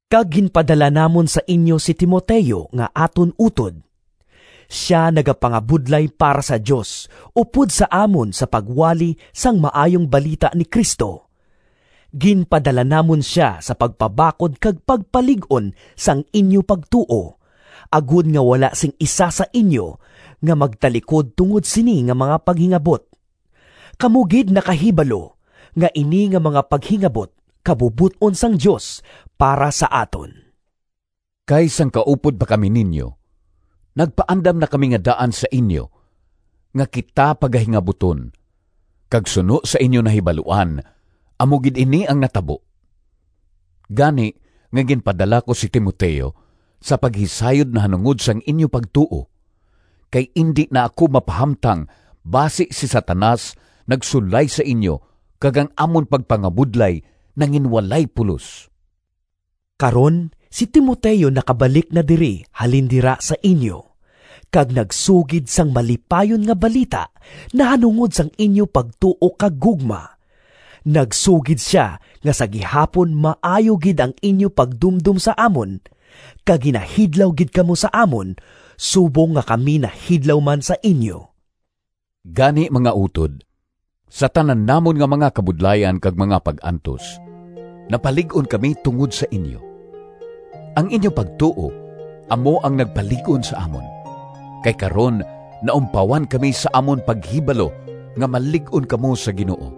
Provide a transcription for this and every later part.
kag ginpadala namon sa inyo si Timoteo nga aton utod. Sia nagapangabudlay para sa Dios upod sa amon sa pagwali sang Maayong Balita ni Cristo. Ginpadala namon sia sa pagpabakod kag pagpalig-on sang inyo pagtuo, agod nga wala sing isa sa inyo nga magtalikod tungod sini nga mga paghingabot. Kamo gid nakahibalo nga ini nga mga paghingabot kabubot-on sang Dios para sa aton. Kay sang kaupod pa kami ninyo, nagpaandam na kami nga daan sa inyo nga kita pagahingabuton, kag suno sa inyo nahibaluan amo gid ini ang natabo. Gani nga ginpadala ko si Timoteo, sa paghisayod nahanungod sang inyo pagtuo, kay indi na ako mapahamtang basi si Satanas nagsulay sa inyo kag ang amon pagpangabudlay nanginwalay pulos! Karon si Timoteo nakabalik na diri halin dira sa inyo, kag nagsugid sang malipayon nga balita nahanungod sang inyo pagtuo kag gugma. Nagsugid sia nga sa gihapon maayo gid ang inyo pagdumdom sa amon, kag ginahidlaw gid kamo sa amon subong nga kami nahidlaw man sa inyo. Gani, mga utod, sa tanan namon nga mga kabudlayan kag mga pag-antos napalig-on kami tungod sa inyo. Ang inyo pagtuo amo ang nagpalig-on sa amon, kay karon naumpawan kami sa amon paghibalo nga malig-on kamo sa Ginoo.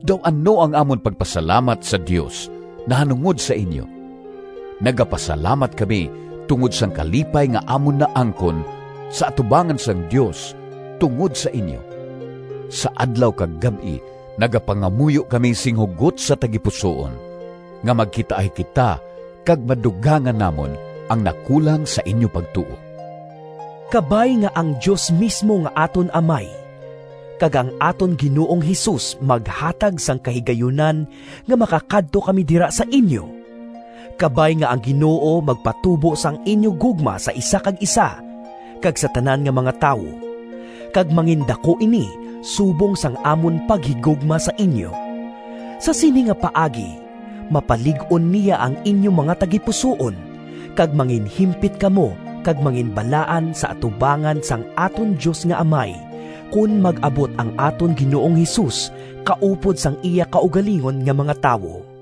Daw ano ang amon pagpasalamat sa Dios nahanungod sa inyo! Nagapasalamat kami tungod sang kalipay nga amon naangkon sa atubangan sang Dios tungod sa inyo. Sa adlaw kag gab-i nagapangamuyo kami sing hugot sa tagipusoon nga magkitaay kita kag madugangan namon ang nakulang sa inyo pagtuo. Kabay nga ang Dios mismo nga aton Amay, kag ang aton Ginoong Jesus maghatag sang kahigayunan nga makakadto kami dira sa inyo! Kabay nga ang Ginoo magpatubo sang inyo gugma sa isa kag isa kag sa tanan nga mga tawo, kag mangindaku ini subong sang amon paghigugma sa inyo. Sa sini nga paagi mapalig-on niya ang inyo mga tagipusoon, kag manginhimpit kamo kag manginbalaan sa atubangan sang aton Dios nga Amay, kon mag-abot ang aton Ginoong Jesus kaupod sang iya kaugalingon nga mga tawo.